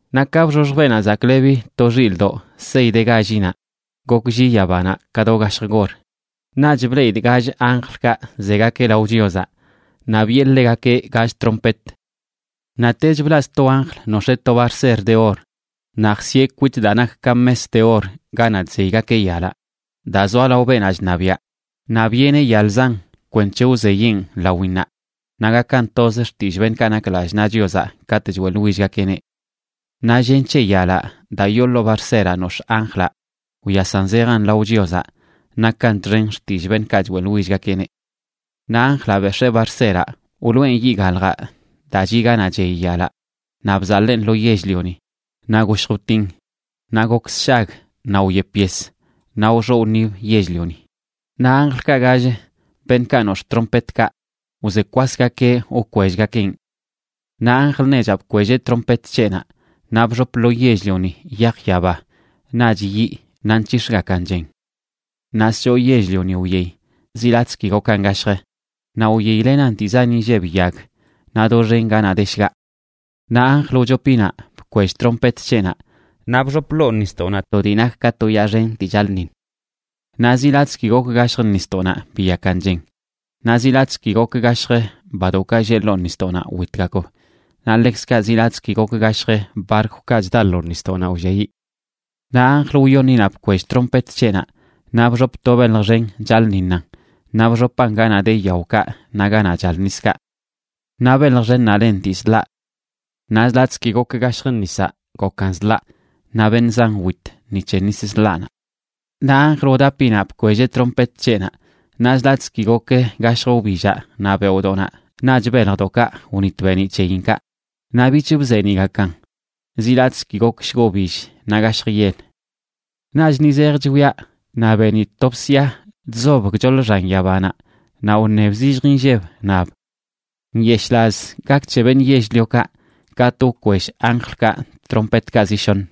Naꞌ ka bxoxj Beenaꞌ Zaklebi to Xilꞌdoꞌ sey de gállinaꞌ, goklli yabanaꞌ ka do gashj gor. Naꞌch bleꞌidꞌ gall anjlkaꞌ zegakeꞌ lao Chiozaꞌ, naꞌ biꞌe ḻegakeꞌ gall trompet. Naꞌtech blaꞌ sto anjl nox̱ee to barser de or, naꞌ jsieꞌ kwit daa nak ka mes de or ganaꞌ chzeygakeꞌ yalaꞌ daa zoa lao beenaꞌ chṉabiaꞌ. Naꞌ biꞌeneꞌ yal zan kwenc̱he wzeyeꞌn lawinnaꞌ, naꞌ gakan toz xtillꞌ beṉꞌkaꞌ nak lallꞌ naꞌ Chiozaꞌ katꞌ choeꞌḻwillgakeꞌneꞌ. Naꞌ llen c̱he yalaꞌ daa yoo ḻoo barseraꞌ nox̱ꞌ anjlaꞌ wyasan zejan lao Chiozaꞌ nakan txen xtillꞌ beṉꞌkaꞌ choeꞌḻwillgakeꞌneꞌ. Naꞌ anjlaꞌ bex̱ee barseraꞌ, wloꞌen yiꞌ gaḻjaꞌ daa chiꞌ ganaꞌ chey yalaꞌ, naꞌ bzaḻeen lo yell-lioni. Naꞌ goshj wtin, naꞌ gok sshag, naꞌ wyep yes, naꞌ wxoꞌ wṉib yell-lioni. Naꞌ anjlkaꞌ gall, beṉꞌkaꞌ nox̱ꞌ trompetkaꞌ, wze kwasgakeꞌ wkwellꞌgakeꞌn. Naꞌ anjl nechaꞌ bkwelleꞌ trompet c̱heꞌnaꞌ, naꞌ bxop lo yell-lioni yaj yaba naꞌch yiꞌ naꞌ nc̱hix̱gakan chen. Naꞌ schoo yell-lioni wyey, zi latꞌzə ki gokan gashjə,a naꞌ wyeylenan dii zan inlleb yag, naꞌ doxen ganaꞌ de shgaꞌ. Naꞌ anjl wchopinaꞌ bkwell trompet c̱heꞌnaꞌ, naꞌ bxop ḻoo nisdoꞌnaꞌ to dii nak ka to yaa xen dii chaḻꞌṉiṉ. Naꞌ zi latꞌzə ki gok gashjə nisdoꞌnaꞌ biyakan chen. Naꞌ zi latꞌzə ki gok gashjə badoꞌkaꞌ lleꞌ ḻoo nisdoꞌnaꞌ witgakb, naꞌ ḻekzkaꞌ zi latꞌzə ki gok gashjə barkwkaꞌ chda lo nisdoꞌnaꞌ wlliayiꞌ. Naꞌ anjl wyoṉinaꞌ bkwell trompet c̱heꞌnaꞌ naꞌ bxop to belj xen chaḻꞌṉiṉan, naꞌ bxopan ganaꞌ de yaokaꞌ naꞌ ganaꞌ chal niskaꞌ. Naꞌ belj xennaꞌ len Dii Zḻaꞌ. Naꞌ zi latꞌzə ki gok gashjə nisaꞌ gokan zḻaꞌ, naꞌ beṉꞌ zan wit ni c̱he nis zḻaꞌnaꞌ. Naꞌ anjl wdapinaꞌ bkwelleꞌ trompet c̱heꞌnaꞌ, naꞌ zi latꞌzə ki gok gashjə wbillaꞌ naꞌ beoꞌdoꞌnaꞌ naꞌch beljdoꞌkaꞌ wnit beeniꞌ c̱heyinkaꞌ. Naꞌ bich bzeeniꞌgakan zi latꞌzə ki gok shgobill naꞌ gashj yel. Naꞌch ni zej chwiaꞌ naꞌ benidꞌ to bsia chzob gchoḻ xan yabanaꞌ naꞌ wṉeb zillj inlleb, nab: ―¡Nyeshꞌlaz gak c̱he beṉꞌ yell-liokaꞌ katꞌ wkwell anjlkaꞌ tompetkaꞌ zi shoṉ!